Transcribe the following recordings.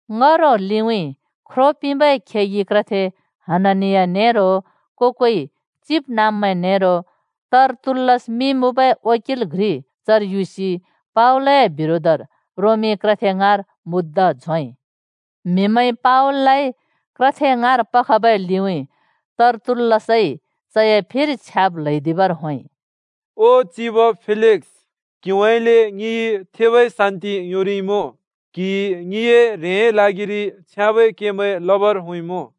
ङ्‍हरो लिउँइँ ख्रो पिंबै खेगि क्रथे हननिया नेरो को-कोइ चिबनाँब्मैं नेरो तर्तुल्‍लस मिं मुँबै वकिल घ्रि चर युसि पावलए बिरोधर रोमी क्रथे ङाँर मुद्दा झोंइ। म्हिमैंइ पावललाइ क्रथे ङाँर पखबै लिउँइँ तर्तुल्‍लसइ चए फिर छ्याब् ल्हैदिबर होंइ, “चिब फेलिक्स, क्हिउँइँले ङिइ थेबै शान्ति योंरिइमुँ, क्हिइ ङिए ह्रेंए ल्हागिरि छ्याँबै केमैं लबर होंइँमुँ।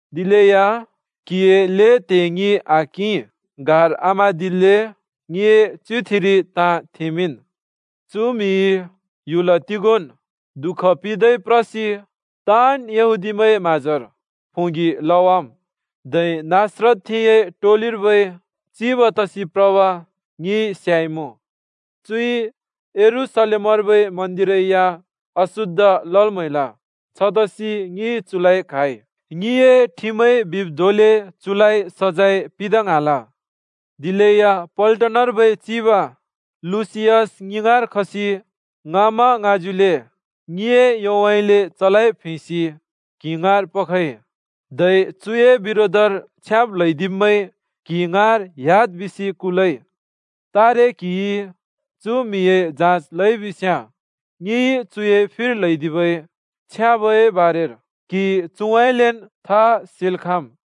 दिलेया क्हिए ल्हें त्हे ङि आकिं। गार आम्हाँदिल्‍ले, ङिए च्युगुथिरि ताँ थेमिंन्। “चु म्हिइ ह्‍युल तिगोंन् दुःख पिंदै प्रसि ताँन् यहूदीमैंए म्हाँजोर प्होंगि लवाम्, धै नासरतथेंए टोलिर्बै चिब तसि प्रब ङिइ स्याइमुँ। चुइ यरूशलेमर्बै मन्दिर या अशुद्ध लल् म्हैल। छतसि ङिइ चुलाइ क्हाइ। [ङिए ठिमइ बिब् धोंले चुलाइ सजैं पिंदा ङ्हाँल। दिलेया पल्टनर्बै चिब लुसियस ङि ङाँर खसि ङाँमाङाँज्युले ङिए योउँइँले चलाइ प्हेंसि क्हि ङाँर पखइ, धै चुए बिरोधर छ्याब् ल्हैदिब्मैं क्हि ङाँर ह्‍याद् बिसि कुलइ।] तारे क्हिइ चु म्हिए जाँच लइबिस्‍याँ ङिइ चुए फिर ल्हैदिबै छ्याबए बारेर क्हिइ चुउँइँलेन् था सेल् खाँम्।”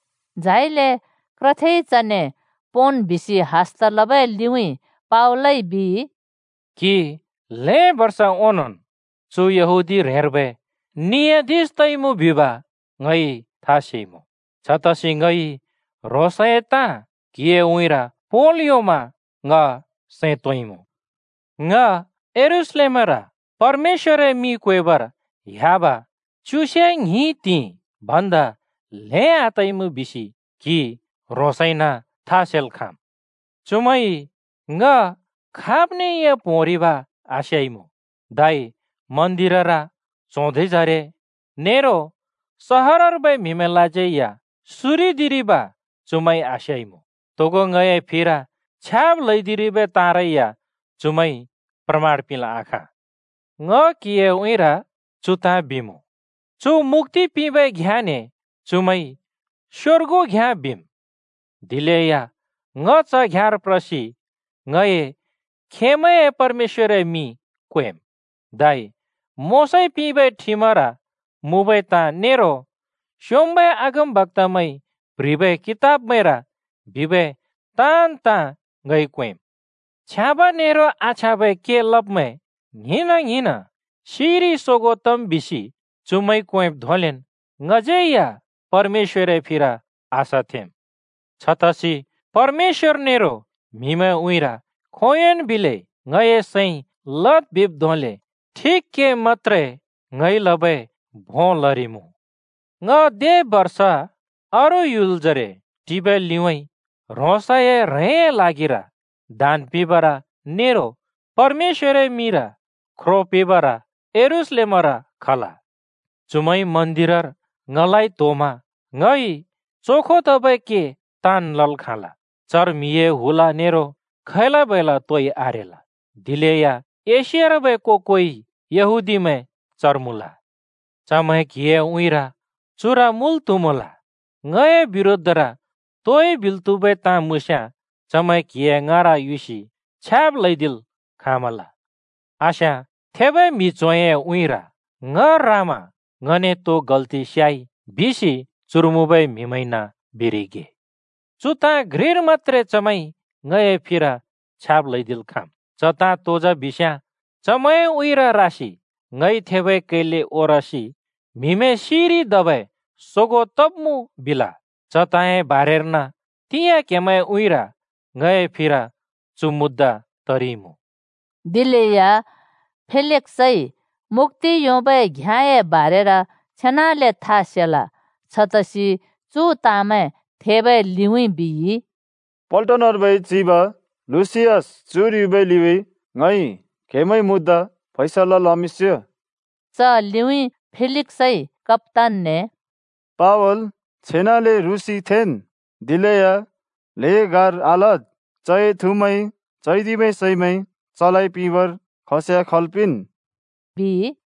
झाइले क्रथेइ चने पोंन् बिसि हस्त लबै लिउँइँ पावलइ बिइ: “क्हि ल्हें बर्ष ओंनोंन् चु यहूदी ह्रेंर्बै नियाधिश तइमुँ बिब ङइ था सेइमुँ। छतसि ङइ ह्रोंसए ताँ क्हिए उँइँर पोंल् योंमा ङ सैं तोंइमुँ। ङ यरूशलेमर परमेश्‍वरए मिं क्वेबर ह्‍याब च्युसे ङ्हिं त्हिंइ भन्दा ल्हें आतइमुँ बिसि क्हि ह्रोंसैन था सेल् खाँम्। चुमैंइ ङ खाब्ने या प्होंरिब आस्याइमुँ, धै मन्दिरर, च्हों धिंजरे, नेरो सहरर्बै म्हिमैंलाज्यै या सुरेदिरिब चुमैंइ आस्याइमुँ, तोगो ङए फिर छ्याब् ल्हैदिरिबै ताँरै या चुमैंइ प्रमाण पिंल् आखाँ। ङ क्हिए उँइँर चु ताँ बिमुँ: चु मुक्‍ति पिंबै घ्याँने चुमैंइ स्योर्गु घ्याँ बिम्, दिलेया ङ च घ्याँर प्रसि ङए खेमैंए परमेश्‍वरए मिं क्वेम्। धै मोशाइ पिंबै ठिमर मुँबै ताँ नेरो स्योंम्बै अगमबक्‍तामैंइ प्ह्रिबै कितबमैंर बिबै ताँन् ताँ ङइ क्वेंम्। छ्याँब ने आछ्याँबै के लब्मैं ङ्हिंना-ङ्हिंन् सिइरि सोगों तम् बिसि चुमैंइ क्वेंब् धोंलेन् ङज्यै या परमेश्‍वरए फिर आशा थेंम्। छतसि परमेश्‍वर नेरो म्हिमैंए उँइँर खोंयोंन् बिले ङए सैंइ लद् बिब् धोंले ठिक के मत्‍त्रे ङइ लबै भों लरिमुँ। “ङ दे बर्ष अरू ह्‍युलजरे टिबै लिउँइँ ह्रोंसए ह्रेंए ल्हागिर दान पिंबर नेरो परमेश्‍वरए मिंर ख्रो पिंबर यरूशलेमर खल। चुमैंइ मन्दिरर ङलाइ त्होमा ङइ चोखो तबै के ताँन् लल् खाँल। चर म्हिए हुल नेरो खै‍ला-बैला तोइ आरेल, दिलेया एशियार्बै को-कोइ यहूदीमैं चर मुँल। चमैं क्हिए उँइँर चुर मुल त्हुमल। ङए बिरोधर तोइ बिल् त्हुबै ताँ मुँस्याँ चमैं क्हिए ङाँर युसि छ्याब् ल्हैदिल् खाँमल। आस्याँ, थेबै म्हि च्होंए उँइँर ङ रामा ङने तो गल्ति स्याइ बिसि चुर मुँबै म्हिमैंइन बिरिगे। चु ताँ घ्रिर मत्‍त्रे चमैंइ ङए फिर छ्याब् ल्हैदिल् खाँम्। च तो जा बिस्याँ चमैंए उँइँर रासि ङइ थेबै कैले ओरसि ‘म्हिमैं सिइरि धबै सोगों तब्मुँ!’ बिल, च ताँए बारेर्न तिंयाँ क्हेमैंए उँइँर ङए फिर चु मुद्दा तरिइमुँ।” दिलेया फेलिक्सइ मुक्‍ति योंबै घ्याँए बारेर छेनाले था सेल। छतसि चु ताँमैं थेबै लिउँइँ बिइ, “पल्टनर्बै चिब लुसियस चुर युबै लिउँइँ ङइ क्हेमैंए मुद्दा फैसला लमिंस्यो।” च लिउँइँ फेलिक्सइ कप्‍तानने “पावल छेनाले रुँसि थेंन्, दिलेया ल्हें गार आलद्। चए थुमैंइ चैदिबै सैमैं चलाइ पिंबर खस्याँ खल् पिंन्,” बिइ।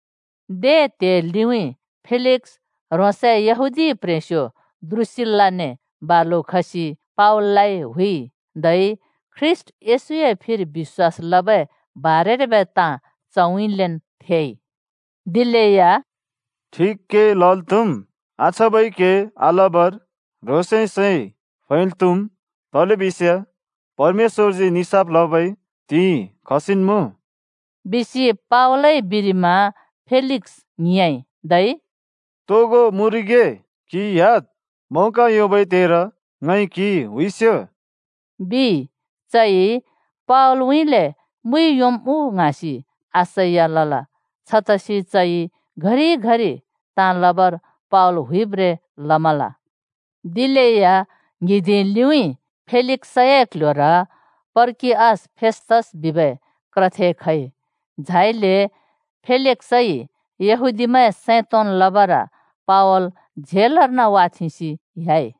दे त्हिंइ लिउँइँ फेलिक्स ह्रोंसए यहूदी प्ह्रेंस्यो द्रुसिल्‍लाने बालु खसि पावललाइ हुइइ। धै ख्रीष्‍ट येशूए फिर बिश्‍वास लबै बारेर्बै ताँ चउँइँलेन् थेइ। दिलेया “ठिक के लल् त्हुम्, आछ्याँबै के आलबर ह्रोंसए सैं फैल् त्हुम्, तलेबिस्याँ परमेश्‍वरजी निसाफ लबै त्हिंइ खसिन् मुँ,” बिसि पावलइ बिरिमा फेलिक्स ङ्हिंयाँइ, धै “तोगो मुँरिगे। क्हि ह्‍याद्। मौका योंबै त्हेर ङइ क्हि हुइस्यो,” बिइ। चइ पावलउँइँले मुइ योंम् उ ङ्हाँसि आशा या लल। छतसि चइ घरि-घरि ताँ लबर पावल हुइब्रें लमल। दिलेया ङ्हिंदिं लिउँइँ फेलिक्सए क्ल्ह्‍योर पर्किअस फेस्‍तस बिबै क्रथे खइ। झाइले फेलिक्सइ यहूदीमैं सैं तोंन् लबर पावल झेलर्न वाथेंसि ह्‍याइ।